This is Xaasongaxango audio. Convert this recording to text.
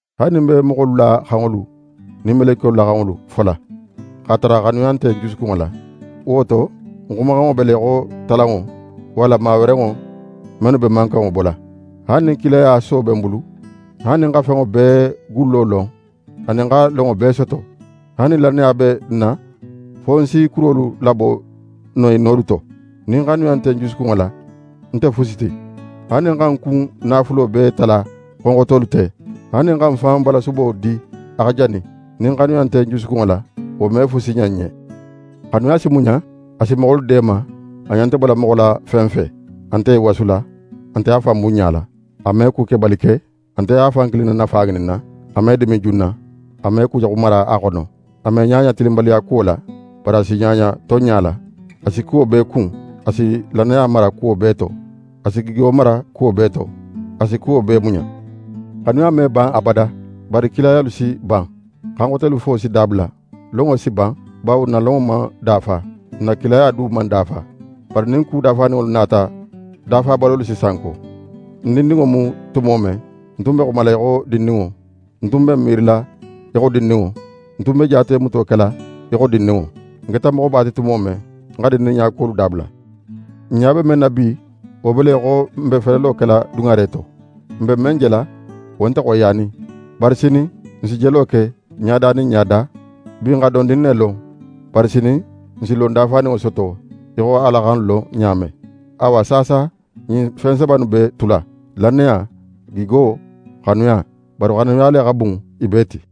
Haali nin ń be moxolu la xanŋolu nin melekiyolu la xanŋolu fola, x'a tara xanuya nte ń jusukunŋo la, wo to ń xumaxanŋo be le í xo talanŋo, walla mawerenŋo mennu be mankanŋo bola. Haali nin kilaya so be ń bulu, haali nin ń xa fenŋo bee gullo lon, anin xa lonŋo bee soto, haali nin lannaya be ń na fo ń si kurolu labo no i nolu to, nin xanuya nte ń jusukunŋo la, ń nte fusi ti. Haali nin ń xa ń kun naafulo bee tala xonxotolu te, haali nin ń xa ń fan balasubo di a xa jani, nin xanuya nte ń jusukunŋo la, wo me fusi ɲan ń ɲen. Xanuya si muɲa, a si moxolu deema, a ɲa nte bola moxo la fen fe. A nte í wasula, a nte a fan bunɲala. A me kukebali ke, a nte a fan kilin na nafa ŋininna. A me dimin junna, a me kujaxu mara a xono. A me ɲaɲa tilinbaliyakuwo la, bari a si ɲaɲa tonɲa la. A si kuwo bee kun, a si lannaya mara kuwo bee to, a si gigo mara kuwo bee to. A si kuwo bee muɲa. Xanuya me ban abada. Bari kilayalu si ban; xan xotelu fo si dabula; lonŋo si ban. Bawo n na lonŋo man dafa; n na kilaya du man dafa. Bari nin ku dafaninŋolu nata, dafabalolu si sanko. Ń dindinŋo mu tumo men, ń tun be xumala í xo dindinŋo; ń tun be ń miirila í xo dindinŋo; ń tun be jaatemuto kela í xo dindinŋo. Ń keta moxoba ti tumo men, ń xa dindinɲakuwolu dabula. N ɲa be men na bi, wo be le í xo n be felelo kela duŋare to. N be men jela, wo nte xoyiyanin. Bari sinin, n si jelo ke, ɲada nin ɲada. Bi, ń xa dondin ne lon; bari sinin, ń si lon dafaninŋo soto í xo Ala xa ń lon ɲa men. Awa, saasa ɲin fen saba innu be tula: Lannaya, gigo, xanuya. Bari xanuya le xa bun i bee ti.